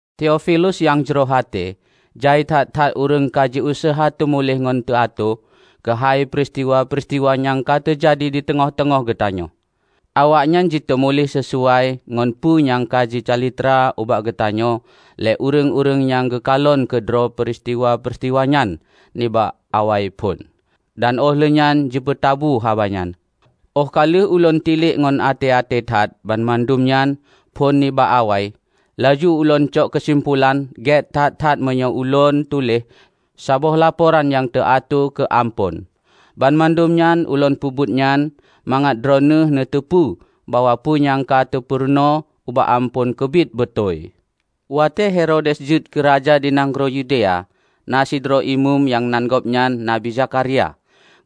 Teofilus nyang jroh até, jai that-that ureuëng ka jiuseuha jiteumuléh ngon teuatoe keuhai peuristiwa-peuristiwa nyang ka teujadi di teungoh-teungoh geutanyoe. Awaknyan jiteumuléh sisuai ngon peue nyang ka jicalitra ubak geutanyoe lé ureuëng-ureuëng nyang geukalon keudroe peuristiwa-peuristiwa nyan nibak awaiphon, dan óh lheueh nyan jipeutabu haba nyan. Óh ka lheueh ulôn tilek ngon até-até that banmandum nyan phon nibak awai, laju lôn cok keusimpulan gét that-that meunyoe ulôn tuléh saboh laporan nyang teuatoe keu Amphon. Banmandum nyang ulôn peubuet nyan, mangat droeneueh neuteupeue bahwa peue nyang ka teupeurunoe ubak Amphon keubiet beutôi. Watée Herodes jeuet keu raja di nanggroe Yudea, na sidroe imeum nyang nan gobnyan Nabi Zakharia,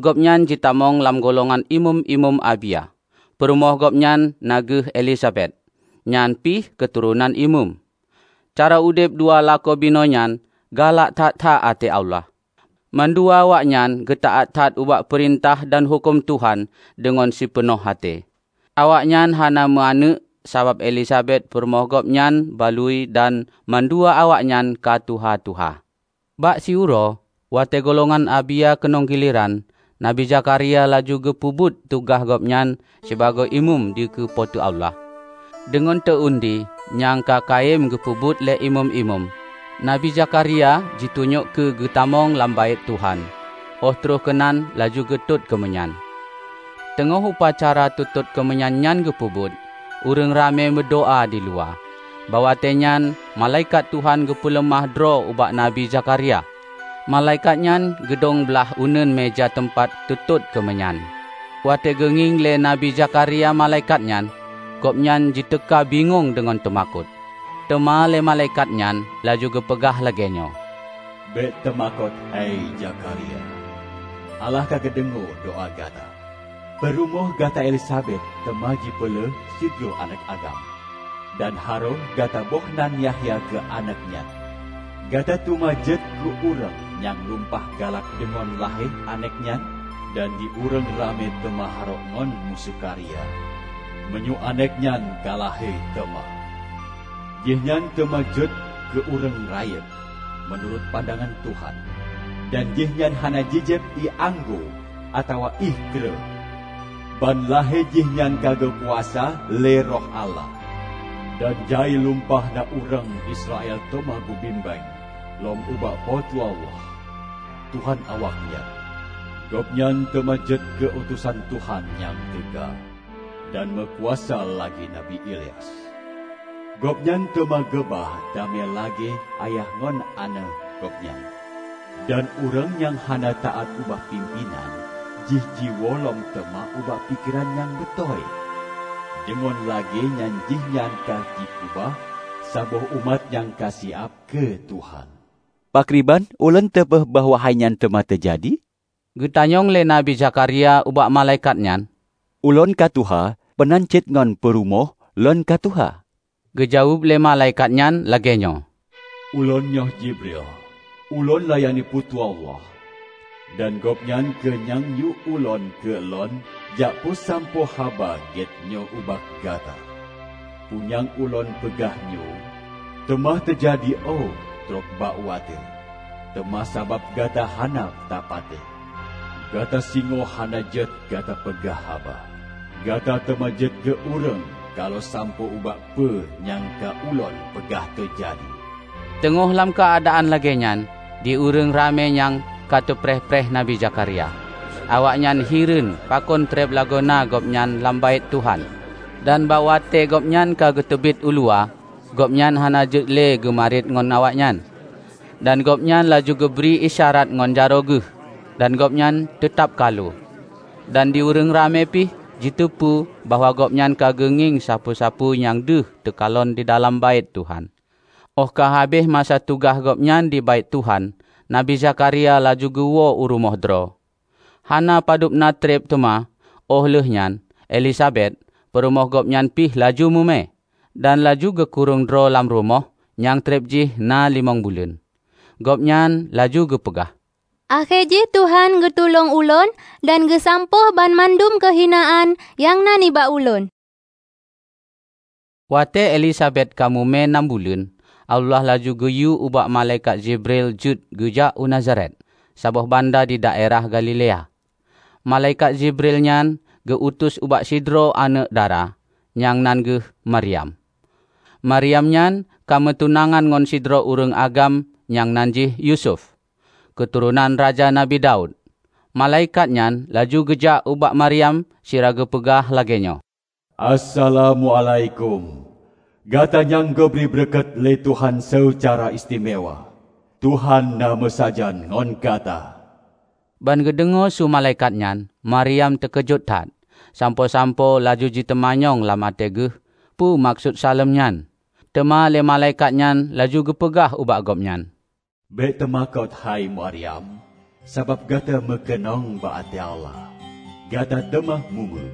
gobnyan jitamong lam golongan imeum-imeum Abia. Peurumoh gobnyan nan geuh Elizabet, nyan pih keuturonan imeum. Cara udeb dua lakoe binoenyan galak that-that até Allah. Mandua awaknyan geutaát that ubak peurintah dan huköm Tuhan deungon sipeunoh até. Awaknyan hana meu aneuëk sabab Elizabet peurumoh gobnyan balui dan mandua awaknyan ka tuha-tuha. Bak siuroe, watée golongan Abia keunong gileran, Nabi Zakharia laju geupeubuet tugaih gobnyan sibagoe Imeum dikeue Po teu Allah. Deungon teu-undi, nyang ka kayém geupeubuet lé imeum-imeum, Nabi Zakharia jitunyok keu geutamong lam Baét Tuhan óh troh keunan laju geutot keumeunyan. Teungoh upacara teutot keumeunyan nyan geupeubuet, ureuëng ramé meudoá diluwa. Bak watée nyan malaikat Tuhan geupeuleumah droe ubak Nabi Zakharia. Malaikat nyan geudong blaih uneuen meuja teumpat teutot keumeunyan. Watée geungieng lé Nabi Zakharia malaikat nyan, gobnyan jiteuka bingong deungon teumakot. Teuma lé malaikat nyan laju geupeugah lagée nyoe, "Bék teumakot, hei Zakharia! Allah ka geudeungoe doá gata. Peurumoh gata Elizabet teuma jipeulahé sidroe aneuëk agam. Dan harôh gata boh nan Yahya keu aneuëk nyan. Gata teuma jeuet keu ureuëng nyang lumpah galak deungon lahé aneuëk nyan dan di ureuëng ramé teuma harok ngon meusukaria meunyoe aneuëk nyan ka lahé teuma! Jihnyan teuma jeuet keu ureuëng rayeuk meunurot pandangan Tuhan, dan jihnyan hana jijieb ié anggô atawa ié kreueh. Ban lahé jihnyan ka geukuasa lé Roh Allah. Dan jai lumpah na ureuëng Israel teuma geubimbéng lom ubak Po teu Allah, Tuhan awaknyan. Gobnyan teuma jeuet keu utosan Tuhan nyang teuga dan meukuasa lagée Nabi Ilyas. Gobnyan teuma geuba damé lagée ayah ngon aneuëk gobnyan, dan ureuëng nyang hana taát ubak pimpénan jih jiwoe lom teuma ubak pikeran nyang beutôi. Deungon lagée nyan jihnyan ka jikeubah saboh umat nyang ka siab keu Tuhan." "Pakriban ulôn teupeu bahwa hainyan teuma teujadi?" geutanyong lé Nabi Zakharia ubak malaikat nyan. "Ulôn ka tuha, meunan cit ngon peurumoh lôn ka tuha." Geujaweueb lé malaikat nyan lagée nyoe, "Ulôn nyoe Jiebrail. Ulôn layani Po teu Allah dan Gobnyan kheueh nyang yue ulôn keu lôn jak peusampoe haba gét nyoe ubak gata. Peue nyang ulôn peugah nyoe, teuma teujadi óh trok bak watée. Teuma sabab gata hana tapatéh, gata singoh hana jeuet gata peugah haba; gata teuma jeuet keu ureuëng kalu sampoe ubak peue nyang ka ulôn peugah teujadi." Teungoh lam keuadaan lagée nyan, di ureuëng ramé nyang ka teupreh-preh Nabi Zakharia. Awaknyan hireuen pakon treb lagoena gobnyan lam Baét Tuhan. Dan bak watée gobnyan ka geuteubiet uluwa, gobnyan hana jeuet le geumariet ngon awaknyan. Dan gobnyan laju geubri isyarat ngon jaroe geuh, dan gobnyan teutab kalu. Dan di ureuëng ramé pih jiteupeue bahwa gobnyan ka geungieng sapeue-sapeue nyang deuh teukalon didalam Baét Tuhan. Óh ka habéh masa tugaih gobnyan di Baét Tuhan, Nabi Zakharia laju geuwoe u rumoh droe. Hana padubna treb teuma óh lheueh nyan, Elizabet, peurumoh geuhnyan pih laju mume, dan laju geukurong droe lam rumoh nyang treb jih na limong buleuen. Gobnyan laju geupeugah, "Akhé jih Tuhan geutulông ulôn dan geusampôh banmandum keuhinaan nyang na nibak ulôn." Watée Elizabet ka mume nam buleuen, Allah laju geuyue ubak malaikat Jiebrail jeuet geujak u Nazaret, saboh banda di daerah Galilea. Malaikat Jiebrail nyan geu-utus ubak sidroe aneuëk dara, nyang nan geuh Maryam. Maryam nyan ka meutunangan ngon sidroe ureuëng agam nyang nan jih Yusuf, keuturonan Raja Nabi Daud. Malaikat nyan laju geujak ubak Maryam sira geupeugah lagée nyoe, "Assalamuálaikum, gata nyang geubri beureukat lé Tuhan seucara istimewa! Tuhan na meusajan ngon gata!" Ban geudeungoe su malaikat nyan Maryam teukeujot that, sampoe-sampoe laju jiteumanyong lam até geuh peue meukeusut saleuem nyan. Teuma lé malaikat nyan laju geupeugah ubak gobnyan, "Bék teumakot, hei Maryam. Sabab gata meukeunong bak até Allah. Gata teuma mume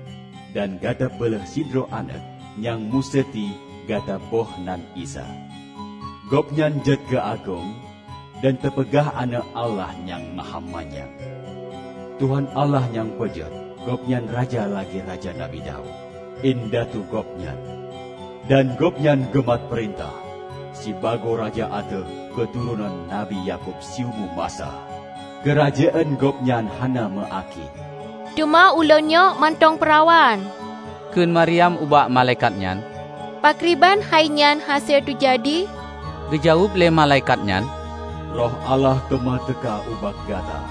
dan gata peulahé sidroe aneuëk, nyang museuti gata boh nan Isa. Gobnyan jeuet keu agong dan teupeugah Aneuëk Allah Nyang Mahamanyang. Tuhan Allah nyang peujeuet gobnyan raja lagée Raja Nabi Daud, indatu gobnyan. Dan gobnyan geumat peurintah sibagoe raja ateueh keuturonan Nabi Yakub siumu masa. Keurajeuen gobnyan hana meu akhé." "Teuma ulôn nyoe mantong peurawan," kheun Maryam ubak malaikat nyan, "pakriban hainyan hase teujadi?" Geujaweueb lé malaikat nyan, "Roh Allah teuma teuka ubak gata,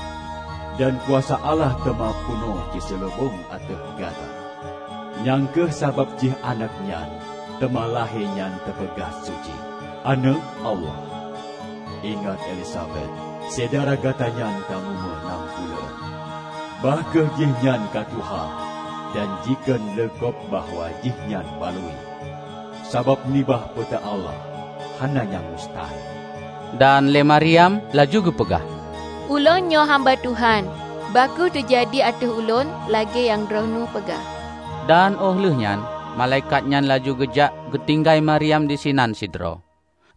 dan kuasa Allah teuma peunoh jiseuleubong ateueh gata. Nyang kheueh sabab jih aneuëk nyang teuma lahé nyan teupeugah Suci, Aneuëk Allah. Ingat: Elizabet, syedara gata nyan ka mume nam buleuen, bah kheueh jihnyan ka tuha dan jikheun lé gob bahwa jihnyan balui. Sabab nibak Po teu Allah hana nyang mustahe." Dan lé Maryam laju geupeugah, "Ulôn nyoe hamba Tuhan; bah kheueh teujadi ateueh ulôn lagée nyang droeneueh peugah." Dan óh lheueh nyan malaikat nyan laju geujak geutinggai Maryam disinan sidroe.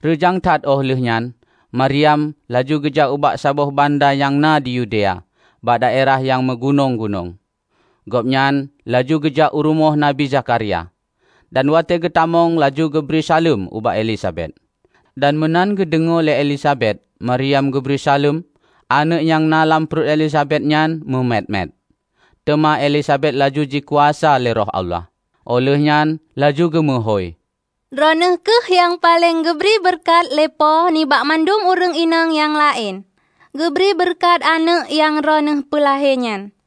Reujang that óh lheueh nyan, Maryam laju geujak ubak saboh banda nyang na di Yudea bak daerah nyang meugunong-gunong. Gobnyan laju geujak u rumoh Nabi Zakharia, dan watée geutamong laju geubri saleuem ubak Elizabet. Dan meunan geudeungoe lé Elizabet Maryam geubri saleuem, aneuëk nyang na lam pluet Elizabet nyan mumet-met. Teuma Elizabet laju jikuasa lé Roh Allah, óh lheuehnyan laju geumeuhôi, "Droeneueh kheueh nyang paleng geubri beureukat lé Po nibak mandum ureuëng inong nyang laén! Geubri beureukat aneuëk nyang droeneueh peulahé nyan!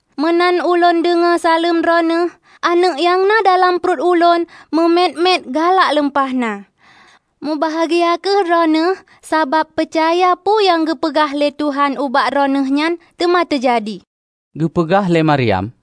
Meunan ulôn deungoe saleuem droeneueh, aneuëk nyang na lam pluet ulôn mumet-met galak lumpah na. Mubahgia kheueh droeneueh, sabab peucaya peue nyang geupeugah lé Tuhan ubak droeneueh nyan teuma teujadi!" Geupeugah lé Maryam,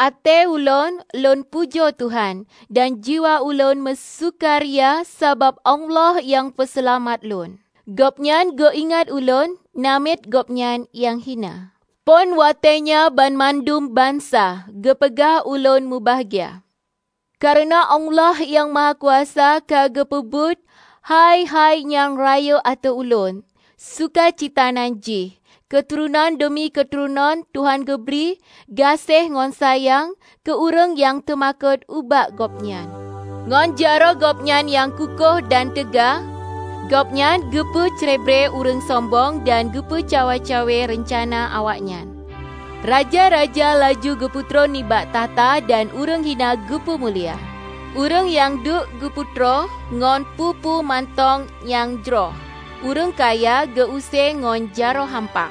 "Até ulôn lôn pujoe Tuhan, dan jiwa ulôn meusukaria sabab Allah nyang Peuseulamat lôn. Gobnyan geuingat ulôn, namiet Gobnyan nyang hina! Phon watée nyoe banmandum bansa geupeugah ulôn mubahgia. Kareuna Allah Nyang Mahakuasa ka geupeubuet hai-hai nyang rayeuk ateueh ulôn. Sukacita nan jih. Keuturonan deumi keuturonan Tuhan geubri gaséh ngon sayang keu ureuëng nyang teumakot ubak Gobnyan. Ngon jaroe Gobnyan nyang kuköh dan teuga gobnyan geupeucrebre ureuëng sombong, dan geupeucawa-cawe reuncana awaknyan. Raja-raja laju geupeutron nibak takhta dan ureuëng hina geupumulia. Ureuëng nyang deuk geupeutroe ngon peue-peue mantong nyang jroh, ureuëng kaya geu-use ngon jaroe hampa.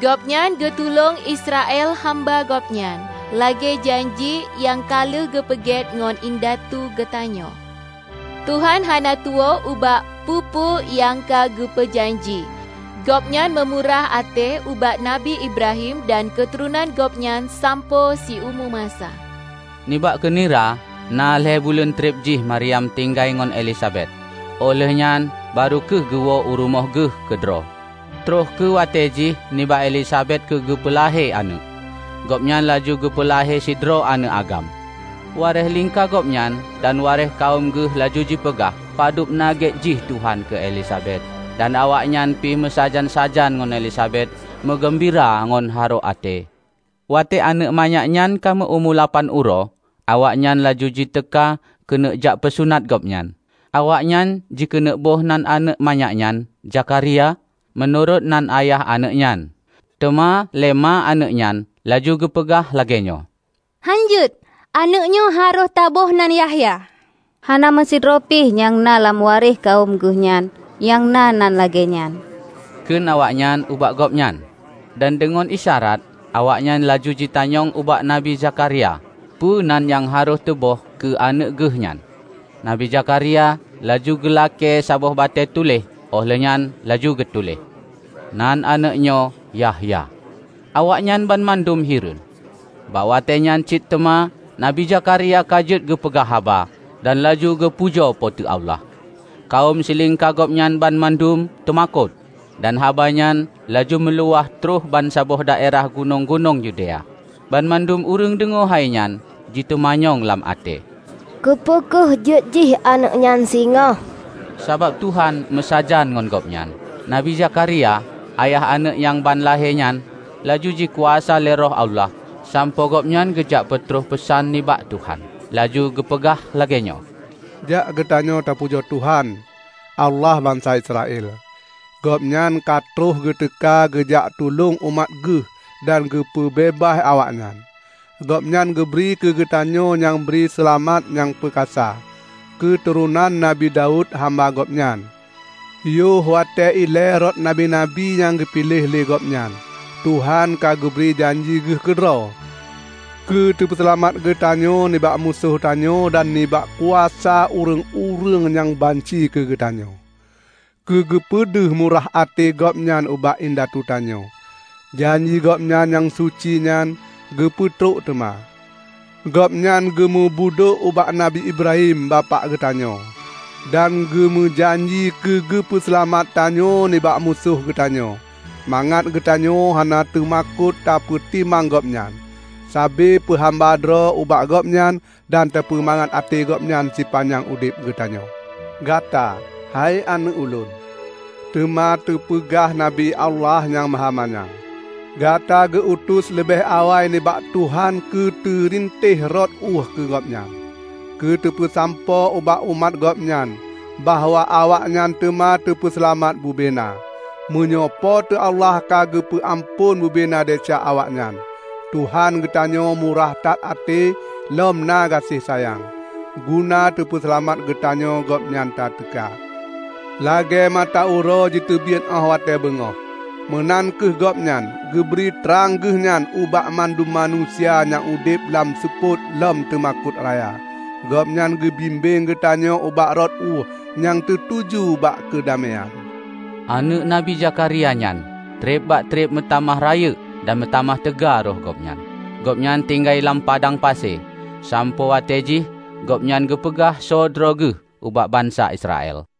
Gobnyan geutulông Israel hamba Gobnyan, lagée janji nyang ka lheueh geupeugét ngon indatu geutanyoe. Tuhan hana tuwoe ubak peue-peue nyang ka geupeujanji, gobnyan meumurah até ubak Nabi Ibrahim dan keuturonan Gobnyan sampoe siumu masa." Nibak keunira na lhée buleuen treb jih Maryam tinggai ngon Elizabet, óh lheueh nyan barô kheueh geuwoe u rumoh geuh keudroe. Troh kheueh watée jih nibak Elizabet keu geupeu lahé aneuëk. Gobnyan laju geupeu lahé sidroe aneuëk agam. Waréh lingka gobnyan dan waréh kawöm geuh laju jipeugah padubna gét jih Tuhan keu Elizabet, dan awaknyan pih meusajan-sajan ngon Elizabet meugeumbira ngon harok até. Watée aneuëk manyak nyan ka meu-umu lapan uroe, awaknyan laju jiteuka keuneuk jak peusunat gobnyan. Awaknyan jikeuneuk boh nan aneuëk manyak nyan Zakharia meunurot nan ayah aneuëk nyan, teuma lé ma aneuëk nyan laju geupeugah lagée nyoe, "Hán jeuet! Aneuëk nyoe harôh teubôh nan Yahya." "Hana meusidroe pih nyang na lam waréh kawöm geuh nyan nyang na nan lagée nyan," kheun awaknyan ubak gobnyan. Dan deungon isyarat, awaknyan laju jitanyong ubak Nabi Zakharia peue nan nyang harôh teubôh keu aneuëk geuh nyan. Nabi Zakharia laju geulakée saboh batée tuléh óh lheueh nyan laju geutuléh, "Nan aneuëk nyoe Yahya." Awaknyan banmandum hireuen. Bak watée nyan cit teuma Nabi Zakharia ka jeuet geupeugah haba dan laju geupujoe Po teu Allah. Kawöm silingka gobnyan banmandum teumakot, dan haba nyan laju meuluwah troh bansaboh daerah gunong-gunong Yudea. Banmandum ureuëng deungoe hainyan jiteumanyong lam até, "Keupeue kheueh jeuet jih aneuëk nyan singoh?" Sabab Tuhan meusajan ngon gobnyan. Nabi Zakharia, ayah aneuëk nyang ban lahé nyan, laju jikuasa lé Roh Allah sampoe gobnyan geujak peutroh peusan nibak Tuhan. Laju geupeugah lagée nyoe, "Jak geutanyoe tapujoe Tuhan, Allah bansa Israel! Gobnyan ka troh geuteuka geujak tulông umat Geuh dan geupeu beubaih awaknyan. Gobnyan geubri keu geutanyoe nyang bri seulamat nyang peukasa, keuturonan Nabi Daud hamba Gobnyan. Yoh watée ilée rot Nabi-nabi nyang geupiléh lé Gobnyan, Tuhan ka geubri janji Geuh keudroe keu teupeuseulamat geutanyoe nibak musoh tanyoe dan nibak kuasa ureuëng-ureuëng nyang banci keu geutanyoe. Keu geupeudeuh murah até Gobnyan ubak indatu tanyoe, janji Gobnyan nyang suci nyan geupeutrok teuma. Gobnyan geumeubudôk ubak Nabi Ibrahim bapak geutanyoe, dan geumeujanji keu geupeu seulamat tanyoe nibak musoh geutanyoe, mangat geutanyoe hana teumakot tapeutimang Gobnyan sabe peuhamba droe ubak Gobnyan dan tapeumangat até Gobnyan sipanyang udeb geutanyoe. Gata, hei aneuëk ulôn, teuma teupeugah Nabi Allah Nyang Mahamanyang. Gata geu-utus leubeh awai nibak Tuhan keu teurintéh rot ueh keu Gobnyan, keu teupeusampoe ubak umat Gobnyan bahwa awaknyan teuma teupeuseulamat bubena, meunyoe Po teu Allah ka geupeu amphon bubena desya awaknyan. Tuhan geutanyoe murah that até lom na gaséh sayang; guna teupeuseulamat geutanyoe Gobnyan tateuka. Lagée mata uroe jiteubiet óh watée beungoh, meunan kheueh Gobnyan geubri trang geuhnyan ubak mandum manusia nyang udeb lam seupôt lom teumakot raya. Gobnyan geubimbéng geutanyoe ubak rot ueh nyang teutuju bak keudaméan." Aneuëk Nabi Zakharia nyan treb bak treb meutamah rayeuk dan meutamah teuga roh Gobnyan. Gobnyan tinggai lam padang pasi, sampoe watée jih Gobnyan geupeugah soe droe geuh ubak bansa Israel.